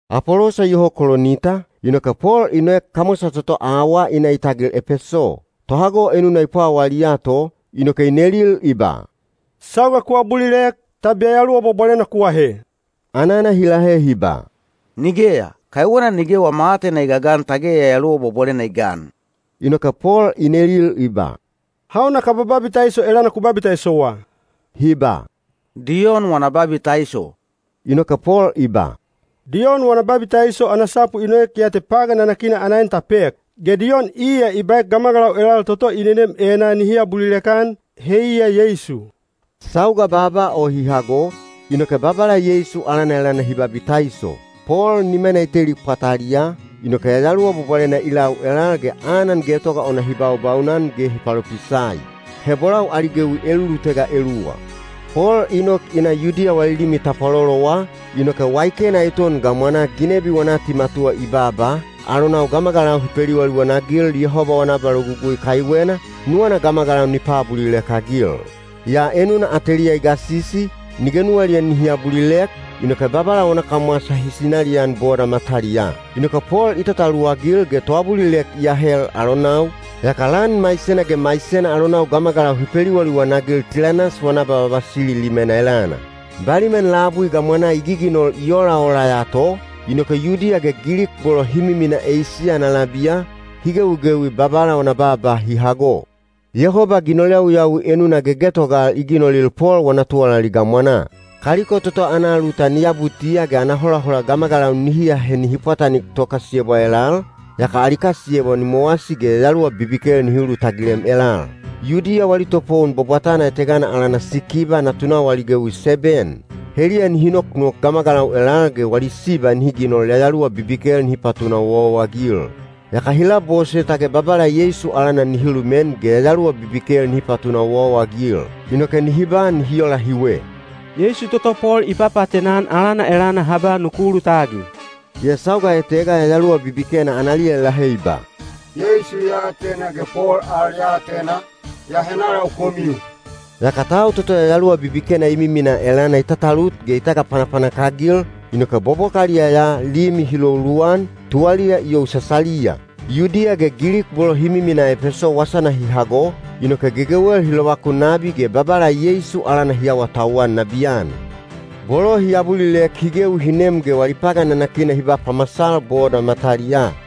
Apolosa iyoho Kolinita, inoke Pol i noek kamwasa toto awaa i na i tagil Epeso. Tohago enuna i pwawaliya to, inoke i nelil i ba, “Sauga ku abulilek, tab Yayaluwa Bwabwalena ku ahe?” Anana hi lahe hi ba, “Nigeya, kaiwena nige wama aatena i gagan tage Yayaluwa Bwabwalena i gan.” Inoke Pol i nelil i ba, “Hauna kaba babitaiso elana ku babitaisowa?” Hi ba, “Diyon wana babitaiso.” Inoke Pol i ba, “Diyon wana babitaiso ana sapu i noek ya te pagan nanakina ana en ta pek. Ge Diyon iya i baek gamagalau elal toto i nenem enaa nihi abulilek-an, heiya Yeisu.” Sauga baaba o hi hago, inoke Babala Yeisu alana elana hi babitaiso. Pol nimana i teli pwataliyaa, inoke Yayaluwa Bwabwalena i lau elal ge anan getoga ona hi baubaunan ge hi palopisai. He bolau ali gewi elulutega eluwa. Pol i nok i na Yudiya wali limi tapwalolowa, inoke waikena eton gamwanaa ginebi wana atimatuwa i baaba, alonau gamagalau hi peliwaliwan-agil Yehoba wana abalogugui kaiwena, nuwana gamagalau ni paabulilek-agil. Yaa enuna ateliya i gasisi, nige nuwaliya nihi abulilek, inoke Babala wana kamwasa hi sinalian boda mataliyaa. Inoke Pol i tataluwagil ge toabulilek i ahel alonau, yaka lan maisena ge maisena alonau gamagalau hi peliwaliwan-agil Tilanas wana abavavasili limena elana. Baliman labui gamwanaa i giginol i olaola ya to, inoke Yudiya ge Gilik bolo hi miminaa Eisiya ana labiya, hi gewigewi Babala wana baaba hi hago. Yehoba ginol yawiyawi enuna gegetogal i ginolil Pol wana tuwalali gamwanaa. Kaliko toto ana alutan i abutiya ge ana holahola gamagalau nihi ahe nihi pwatanik tokasiyebwa elal, yaka ali kasiyebwa ni mowasi ge yayaluwa bibikel nihi ulutagilem elal. Yudiya wali topowon bwabwatana etegana alana Sikiba natunau ali gewi seben. Heliya nihi noknok gamagalau elal ge wali siba nihi ginol yayaluwa bibikel nihi patuna owaowa-agil. Yaka hi labose tage Babala Yeisu alana nihi lumen ge yayaluwa bibikel nihi patuna owaowa-agil. Inoke hi babaa ola hiwe: “Yeisu toto Pol i papaatena-an alana elana ha ba nuku ulutagil.” Yaa sauga etega yayaluwa bibikena analiya i lahe i ba, “Yeisu ya atena ge Pol al ya atena, yaa henalau komiu?” Yaka tau toto yayaluwa bibikena i miminaa elana i tatalut ge i tagapanapanak-agil, inoke bobokaliya ya limi hi lou luwan, tuwaliya i yousasaliya. Yudiya ge Gilik bolo hi miminaa Epeso wasana hi hago, inoke gegewel hi lovakun nabi ge Babala Yeisu alana hi awatauwan nabiyan. Bolo hi abulilek hi gewi hi nem ge wali pagan nanakina hi ba pamasal boda mataliyaa.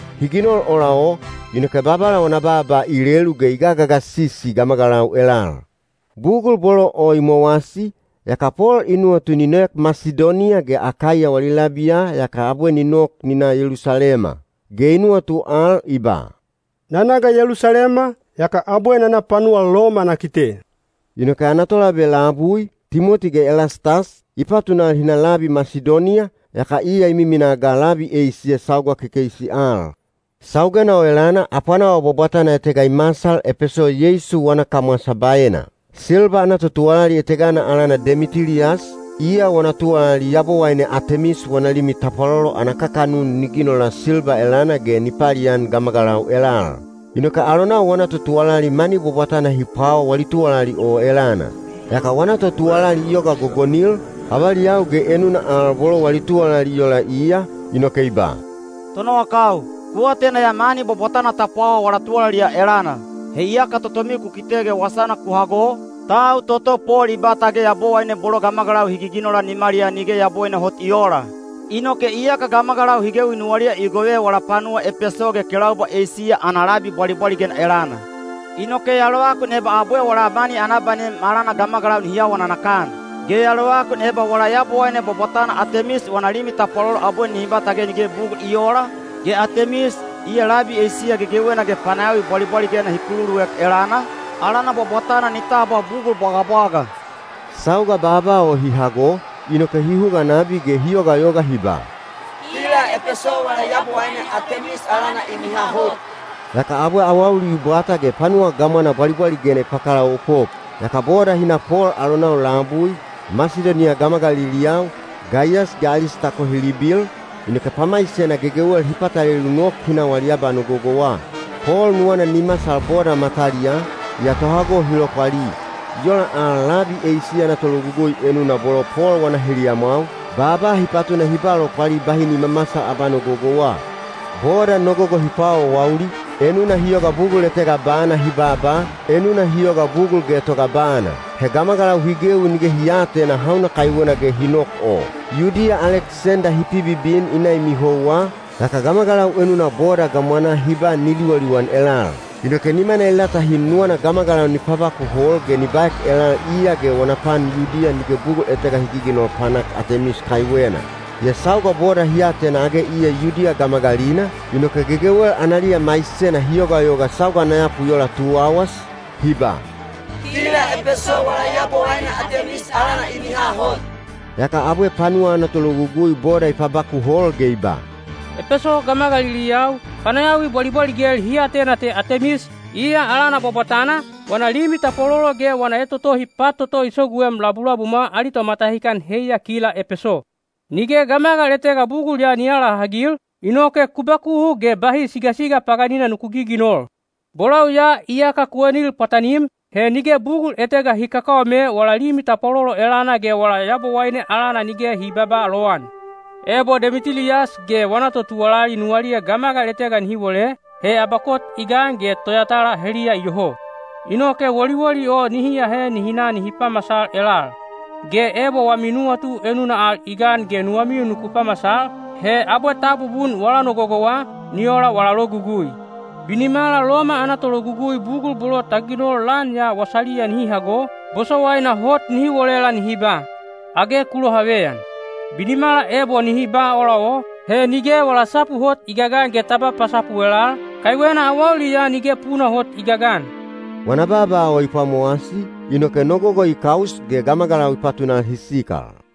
Hi ginol ola o, inoke Babala wana baaba i lelu ge i gagagasisi gamagalau elal. Bugul bolo o i mowasi, yaka Pol i nuwatu ni noek Masidoniya ge Akaiya wali labiya yaka abwe ni nok ni na Yelusalema. Ge i nuwatu al i ba, “Na na ga Yelusalema, yaka abwe na na panuwa Loma na kite.” Inoke ana tolabe labui, Timoti ge Elastas, i patunal hi na labi Masidoniya, yaka iya i miminaa ga labi Eisiya sauga kekeisi al. Saugena o elana apwanawa bwabwatana etega i masal Epeso Yeisu wana kamwasa baena. Silba ana totuwalali etegana alana Demitiliyas, iya wana tuwalali yabowaine Atemis wana limi tapwalolo ana kakanun ni ginola silba elana ge ni palian gamagalau elal. Inoke alonau wana totuwalali mani bwabwatana hi pwawaa wali tuwalali o elana. Yaka wana totuwalali i yoga gogonil, avaliyau ge enuna al bolo wali tuwalali i ola iya, inoke i ba, “Tonowakau, ku atena ya mani bwabwatana ta pwawa wala tuwalali ya elana. He iyaka totomiu ku kite ge wasana ku hago, tau toto Pol i ba tage yabowaine bolo gamagalau hi giginola nimaliyaa nige yabowaine hot i oola. Inoke iyaka gamagalau hi gewi nuwaliya i gove wala panuwa Epeso ge kelaubwa Eisiya ana labi bwalibwaligena elana. Inoke ya lovakun eba abwe wala mani ana abanem alana gamagalau nihi awa nanakan. Ge ya lovakun eba wala yabowaine bwabwatana Atemis wana limi tapwalolo abwe nihi ba tage nige bugul i oola, ge Atemis, iya labi Eisiya gegewena ge panayawi bwabwaligena hi kululuek elana, alana bwabwatana ni tabwa bugul bwagabwaga.” Sauga baaba o hi hago, inoke hi huga nabi ge hi yogayoga hi ba, “Kila Epeso wala yabowaine Atemis alana i miha hot.” Yaka abwe awauli i bwata ge panuwa gamwana bwalibwaligena i pakalaopop. Yaka boda hi na Pol alonau labui, Masidoniya gamagaliliyau, Gaiyas ge Alistako hi libil, inoke pamaisena gegewel hi patalelu nok hi na wali abanogogowa. Pol nuwana ni masal boda mataliyaa, yaa tohago hi lopwali. I ola al labi Eisiya ana tologugui enuna bolo Pol wana heliyamwau, baaba hi patuna hi ba lopwali bahi ni mamasal abanogogowa. Boda nogogo hi paawaawauli, enuna hi yoga bugul etega bana hi babaa, enuna hi yoga bugul getoga bana. He gamagalau hi gewi nige hi aatena hauna kaiwena ge hi nok o. Yudiya Aleksenda hi pibibin i na i mihouwa, yaka gamagalau enuna boda gamwanaa hi ba ni liwaliwan elal. Inoke nimana i latahin nuwana gamagalau ni pabakuhol ge ni baek elal iya ge wana pan Yudiya nige bugul etega hi giginol panak Atemis kaiwena. Yaa sauga boda hi atena age iya Yudiya gamagalina, inoke gegewel analiya maisena hi yogayoga sauga ana yapu i ola tu auwas, hi ba, “Kila Epeso wala yabowaine Atemis alana i miha hot.” Yaka abwe panuwa ana tologugui boda i pabakuhol ge i ba, “Epeso gamagaliliyau, panayawi bwalibwaligel hi atena te Atemis, iya alana bwabwatana, wana limi tapwalolo ge wana etotohi pat toto i soguem labulabumwa ali tomatahikan heiya kila Epeso. Nige gamagal etega bugul ya ni aalahagil, inoke ku bakuhu ge bahi sigasiga paganina nuku giginol. Bolau ya iyaka ku enil pwatanim, he nige bugul etega hi kakaome wala limi tapwalolo elana ge wala yabowaine alana nige hi babaa lowan. Ebo Demitiliyas ge wana totuwalali nuwaliya gamagal etega nihi wole, he abakot i gan ge toyatala heliya iyoho. Inoke woliwoli o nihi ahe nihi na nihi pamasal elal. Ge ebo wami nuwatu enuna al i gan ge nuwamiu nuku pamasal, he abwe ta abubun wala nogogowa, ni ola wala logugui. Binimala Loma ana tologugui bugul bolo ta ginol lan ya wasaliya nihi hago, bosowaina hot nihi wolela nihi ba, ‘Age ku lohaveyan.’ Binimala ebo nihi ba ola o, he nige wala sapu hot i gagan ge ta ba pasapu elal, kaiwena awauli ya nige puna hot i gagan.” Wana baaba o i pwamowasi, inoke nogogo i kaus ge gamagalau i patunal hi sikal.